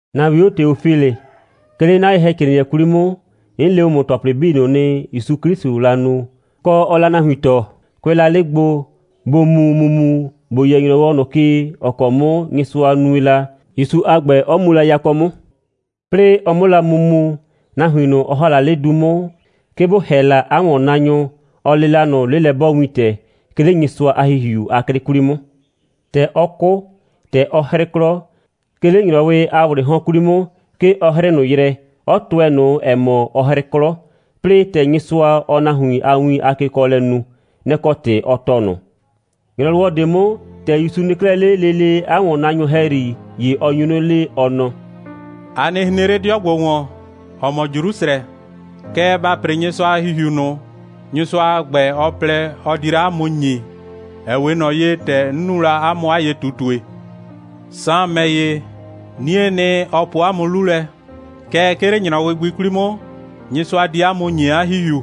‑Na 'wio Teofilɩ. 'Ke 'le 'na ye‑hɛcrɩɩnɩɛ 'kwli 'mʋ, 'n le ‑mʋ ‑tɔplɩ 'bii ꞊nʋ nɩ, ‑Yusu 'Klɩsʋʋ la nu, kɔ, ɔɔ la nahuin tɔɔ, kʋɛ la 'le gbo, ‑bo mu ‑mumu, ‑bo yɛ ‑nyrɔwɔ ꞊nʋ ke, ‑ɔ kɔ 'mʋ Nyɩsʋa nue la, ‑Yusu a ‑gbɛ 'ɔ mu la yakɔ 'mʋ. 'Plɩɩ ɔ 'mʋ la mu mu, nahuin ꞊nʋ, ɔ ‑ha la 'le du 'mʋ, 'ke bʋ ‑hɛ la 'a ‑wɔnnaanyʋ, 'ɔ le la ꞊nʋ 'lelɛ'bɔɔwintɛ, 'ke 'le Nyɩsʋa a ‑Hihiu a 'klɩ 'kwli 'mʋ. ‑Tɛ ɔ 'kʋ, ‑tɛ ɔ 'hrɩ 'klɔ, 'ke 'le ‑nyrɔwɩ a ‑wlɩɩ 'hɔn 'kwli 'mʋ, 'ke ɔ 'hrɩɩ ꞊nʋ yrɛ, 'ɔ tʋɛ ꞊nʋ, ‑ɛ mɔ, ɔ 'hrɩ 'klɔ, 'plɩɩ ‑tɛ Nyɩsʋa, ɔɔ nahuin a win a kekɔɔlɛ nu. Nɛ‑ kɔ ‑tɩ ɔ tɔɔ ꞊nʋ. ‑Nyrɔwɔ ꞊de 'mʋ, ‑tɛ ‑Yusu nɩ 'klɛɛ 'le lele 'a ‑wɔnnaanyʋ ‑hɛyri, ‑ye ɔ nyu 'nɩ le, ɔ nɔ: «A nɩ hren 'le 'dɩɔ ‑gbo ‑wɔn, ‑ɔ mɔ Jrusrɛ, kɛɛ, ba ‑pre Nyɩsʋa a ‑Hihiu ꞊nʋ, Nyɩsʋa a ‑gbɛ, ɔ plɛ, ɔ di la 'a mʋ ‑nyi, ‑ɛ 'we ꞊nɔ ye, ‑tɛ 'n nu la 'a mʋ 'a ye꞊tutue. Saan ‑mɛ ‑ye, 'niee nɩ, ɔ po 'a mʋ 'lu lɛ, kɛɛ, 'ke 'le ‑nyrɔwɩ gbi 'kwli 'mʋ, Nyɩsʋa di 'a mʋ ‑nyi 'a ‑Hihiu.»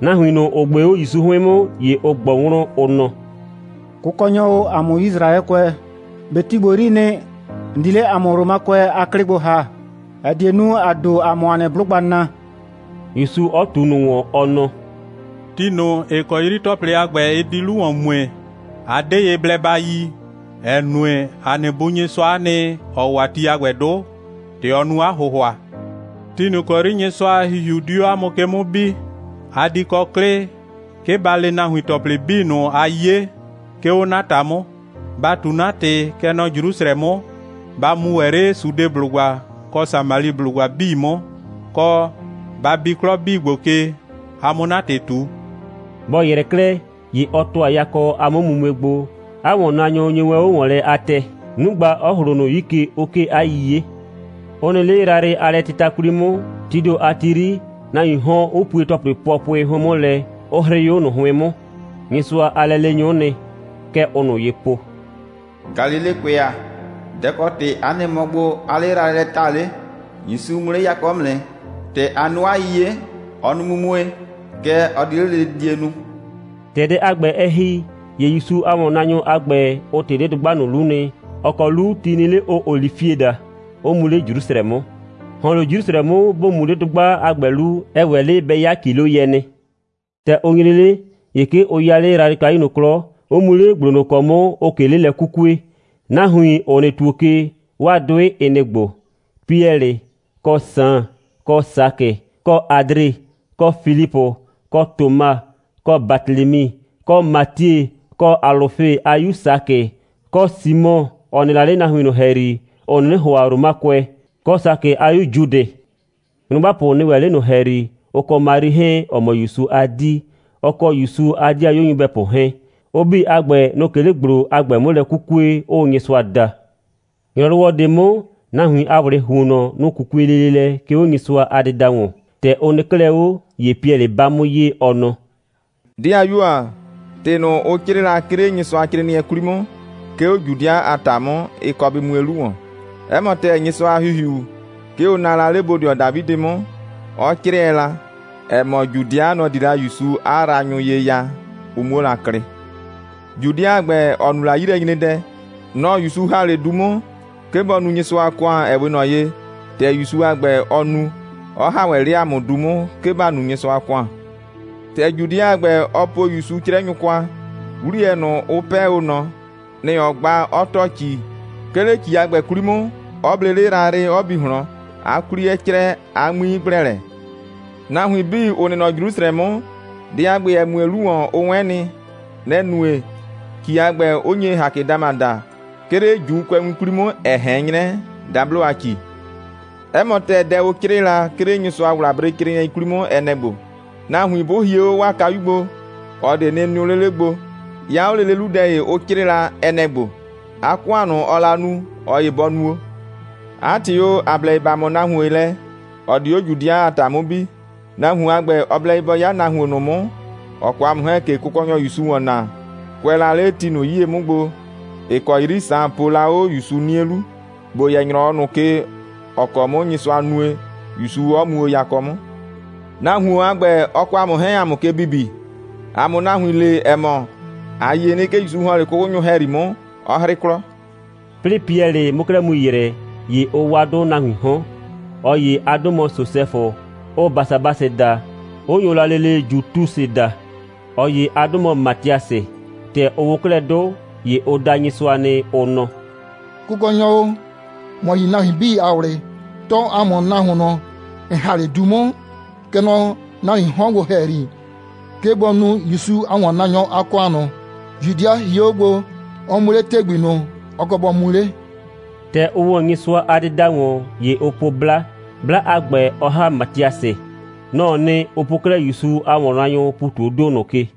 Nahuin ꞊nʋ, ‑ʋ ꞊gbee 'o ‑Yusu 'hʋɩn 'mʋ, ‑ye ʋ ꞊gbɔ wlɔn, ʋ nɔ: «Kʋkɔnyɔ o, ‑a mʋ Yisraɛkʋɛ, ꞊be ti ‑gbo 'yrii nɩ, ‑n di 'le ‑a mʋ Romakʋɛ a 'klɩ gbo ‑ha, ‑ɛ die nu, ‑a ‑do, ‑a 'mʋ ‑a nɩ 'blʋgba naa,» ‑Yusu 'ɔ ꞊tu ꞊nʋ ‑wɔn, ɔ nɔ: «Ti ꞊nʋ, ‑ɩ kɔ 'yri ‑tɔplɩ a ‑gbɛ, ɩ di 'lu ‑wɔn mue, a 'de ye blɛ ba yi, ‑ɛ nue, ‑a nɩ Bu Nyɩsʋa'a nɩ, ‑ɔ wa ti a ‑gbɛ 'dʋ, ‑tɛ ɔ nu 'a ‑hʋhʋa. Ti ꞊nʋ ‑kɔ 'yri Nyɩsʋa a ‑Hihiu di 'o 'a mʋ ke 'mʋ bi, a di kɔ 'klɩ, 'ke ba le nahuin ‑tɔplɩ 'bii ꞊nʋ, a 'ye, 'ke 'o 'na ‑ta 'mʋ. Ba ꞊tu 'na ‑tɩ, kɛ nɔ Jrusrɛ 'mʋ, ba mu ‑wɛ 'le Sudeblʋgba kɔ Samaliblʋgba 'bii 'mʋ, kɔ, ba bi 'klɔ 'bii ‑gbo ke, a 'mʋ 'na ‑tɩ ꞊tu.» Bɔ ‑yrɛ 'klɛɛ, ‑ye ɔ ‑tʋa yakɔ a 'mʋmumue gbo. 'A ‑wɔnnaanyʋ nyo wɛn 'o ‑wɔn lɛ a tɛɛ, 'nugba 'ɔ ‑hlo ꞊nʋ 'yi ke, 'ʋ 'kee 'a 'yiye. Ʋ nɩ 'le yrayrɩ a lɛtɩta 'kwli 'mʋ, tii ‑do a ti 'yri, nahuiin 'hɔn, ‑ʋ pue ‑tɔplɩ pʋɔpʋɩ 'hʋɩn 'mʋ lɛ, 'ʋ 'hrɩɩ 'o ꞊nʋ 'hʋɩn 'mʋ. Nyɩsʋa a lɛleenyʋ'ʋ nɩ. Kɛ ʋʋ ꞊nʋ ye po: «Galilekʋɛ ‑a, dɛ‑ kɔ ‑tɩ 'a nɩ mɔ gbo, 'aa 'le yrayrɩ lɛ ta 'le? ‑Yusu mu 'le yakɔ 'mʋ nɩ. ‑Tɛ a nu 'a 'yiye, ɔ nu mumue, kɛ ɔ di 'le lele didie nu.» ‑Tɛ dɛ a ‑gbɛ, ɛ ‑hi, ‑ye ‑Yusu a ‑wɔnnaanyʋ a ‑gbɛ, ʋ ꞊tɩ 'le dʋgba ꞊nʋ 'lu nɩ, ‑ɔ kɔ 'lu ti nɩ 'le, ʋʋ olifie daa, 'ʋ mu 'le Jrusrɛ 'mʋ. ‑Hɔn 'le Jrusrɛ 'mʋ, ‑bo mu 'le dʋgba a ‑gbɛ 'lu, ɛ ‑wɛ 'le bɛ 'ya ‑kiloyɛ nɩ. ‑Tɛ ʋ nyre 'le, ‑ye 'ke ʋ 'ya 'le yrayrɩkayu ꞊nʋ 'klɔ, 'ʋ mu 'le ‑gblo ꞊nʋ ‑kɔ 'mʋ, ʋʋ ꞊ke 'le lɛ 'kukue. Nahuin, ‑ʋ nɩ ‑tuo ke, 'waa 'dʋɩ, ɩ nɩ‑ ‑gbo: Piɛlɩ, kɔ Saan, kɔ Sakɩ, kɔ Adre, kɔ Filipʋ, kɔ Toma, kɔ Batelemi, kɔ Matie, kɔ Alʋfe a 'yu Sakɩ, kɔ Simɔ, ‑ɔ nɩ la 'le nahuin ꞊nʋ ‑hɛyri, ‑ʋ 'nɩnɩ ‑hʋa Romakʋɛ, kɔ Sakɩ a 'yu Judɩ. Nyrʋgbapʋ nɩ ‑wɛ 'le ꞊nʋ ‑hɛyri, ʋ kɔ Mari 'hɛɛn, ‑ɔ mɔ ‑Yusu a 'dii, ʋ kɔ ‑Yusu a 'dɩayuo nyɩbɛpʋ 'hɛɛn. Ʋ 'bii a ‑gbɛ, nʋ‑ʋ ꞊ke 'le ‑gblo a ‑gbɛ 'mʋ lɛ 'kukue, 'ʋʋ Nyɩsʋa da. ‑Nyrɔwɔ ꞊de 'mʋ, nahuin a ‑wlɩɩ ‑huonnɔ, nʋ‑ 'kukue lele lɛ, 'ke 'o Nyɩsʋa a dɩda ‑wɔn. ‑Tɛ ʋ nɩ 'klɛɛ 'o, ‑ye Piɛlɩ 'ba 'mʋ ye, ɔ nɔ: «‑Dɩayuo ‑a, ‑tɩ ꞊nʋ, ʋ 'crɩɩ la, 'ke 'le Nyɩsʋacrɩɩnɩɛ 'kwli 'mʋ, ('ke 'o Judɩa a ‑ta 'mʋ,) ɩ kɔ bɩ mue 'lu ‑wɔn. 'Ɛ mɔ ‑tɛɛ, Nyɩsʋa a ‑Hihiu, 'ke ʋ naa la 'le bodɩɔ Dafidɩ 'mʋ, 'ɔ 'crɩɛ la, ‑ɛ mɔ, Judɩa, nɔ‑ di la ‑Yusu 'a yraanyʋ ye ya, ʋ 'muo la klɩ. Judɩa a ‑gbɛ, ‑ɔ nu la 'yilɛnyredɛ, nɔ‑ ‑Yusu ‑ha 'le du 'mʋ, 'ke bɔ nu Nyɩsʋa a ‑kʋan, ‑ɛ 'we ꞊nɔ ye, ‑tɛ ‑Yusu a ‑gbɛ, ɔ nu, 'ɔ ‑ha ‑wɛ 'le ‑a mʋ du 'mʋ, 'ke ‑ba nu Nyɩsʋa a ‑kʋan. ‑Tɛ Judɩa a ‑gbɛ, ɔ po ‑Yusu 'crɛnyʋ kwa, 'wliyɛ ꞊nʋ, ʋ 'pɛɛ o ꞊nɔ, nɛ‑ ɔ gba, 'ɔ ‑tɔ ‑ci, 'ke 'le ‑ci a ‑gbɛ 'kwli 'mʋ, 'ɔ ble 'le yrayrɩ, 'ɔ bi ꞊hlɔn, 'a 'kwli 'ɛ crɛ, 'a 'ŋmi 'ɩ ‑gblɛ lɛ. Nahuin 'bii, ‑ʋ nɩ nɔ Jrusrɛ 'mʋ, dɛ a ‑gbɛ, ‑ɛ mue 'lu ‑wɔn, ʋ 'wɛn nɩ. Nɛ‑ nue, ‑ci a ‑gbɛ, 'ʋ nye Hakɛdama daa, 'ke 'le ‑Juukʋɛwin 'kwli 'mʋ, ‑ɛ ꞊hɛn 'nyrɛ dablo a ‑ci. 'Ɛ mɔ ‑tɛɛ, dɛ ʋ 'crɩɩ la, 'ke 'le Nyɩsʋa a ‑wlabrecrɩɩnɩɛ 'kwli 'mʋ, ɛ nɛ‑ ‑gbo: Nahuin bʋ hie 'o 'a kayu gbo, ꞊ɔ ꞊de nɩ nɩʋ 'le 'le gbo. 'Ya 'o lele 'lu, dɛ ‑ye, ʋ 'crɩɩ la, ɛ nɛ‑ ‑gbo: 'A ‑kʋan ꞊nʋ, ɔɔ la nu, ꞊ɔ ‑ye bɔ nuo! 'A ‑tɩ o, ‑a blɛ ye ‑ba ꞊mɔ nahuon lɛ, ‑ɔ di 'o Judɩa a ‑ta 'mʋ bi. Nahuon a ‑gbɛ, ɔ blɛ ye bɔ 'ya nahuon ꞊nʋ 'mʋ, ‑ɔ kɔ ‑a mʋ 'hɛɛn ꞊ke Kʋkɔnyɔ ‑Yusu ‑wɔn naa, kʋɛ la 'le ti ꞊nʋ 'yie 'mʋ gbo, ‑ɩ kɔ 'yri Saan po la 'o ‑Yusu 'nie 'lu, ‑bo yɛ ‑nyrɔwɔ ꞊nʋ ke, ‑ɔ kɔ 'mʋ Nyɩsʋa nue, ‑Yusu 'ɔ mu o yakɔ 'mʋ. Nahuon a ‑gbɛ, ɔ kɔ ‑a mʋ 'hɛɛn, ‑a 'mʋ ke bibi, ‑a 'mʋ nahuin le, ‑ɛ mɔ, ‑a yie nɩ, 'ke ‑Yusu ‑hɔn 'le 'kʋkʋnyʋ ‑hɛyri 'mʋ, 'ɔ 'hrɩ 'klɔ.» 'Plɩɩ Piɛlɩ 'mʋ 'klɛɛ mu ‑yrɛ, ‑ye ʋ wa 'dʋ nahuiin 'hɔn. ꞊Ɔ ‑ye a 'dʋ mɔ Sosɛfʋ, ʋʋ Basabasɩ daa, 'ʋ nyo la lele Jutusɩ daa. ꞊Ɔ ‑ye a 'dʋ mɔ Matiasɩ. ‑Tɛ ʋ wʋ 'klɛɛ 'dʋ, ‑ye ʋ da Nyɩsʋa nɩ, ʋ nɔ: «Kʋkɔnyɔ o, ‑mɔ yi nahuin 'bii a ꞊wlɩ, tɔɔ ‑a mʋ nahuon ꞊nʋ, ‑n ‑ha 'le du 'mʋ, kɛ nɔ nahuiin 'hɔn ‑gbo ‑hɛyri, 'ke bɔ nu ‑Yusu a ‑wɔnnaanyɔ a ‑kʋan ꞊nʋ, Judɩa hie 'o gbo, 'ɔ mu 'le ‑tɛgbi ꞊nʋ, ɔ kɔ bɔ mu 'le.» ‑Tɛ ʋ ‑wɔ Nyɩsʋa a dɩda ‑wɔn, ‑ye ʋ po 'bla, 'bla a ‑gbɛ 'ɔ ‑ha Matiasɩ. Nɔ‑ɔ nɩ, ʋ po 'klɛɛ ‑Yusu a ‑wɔnnaanyʋʋ ‑pu ꞊tu 'o ‑do ꞊nʋ ke.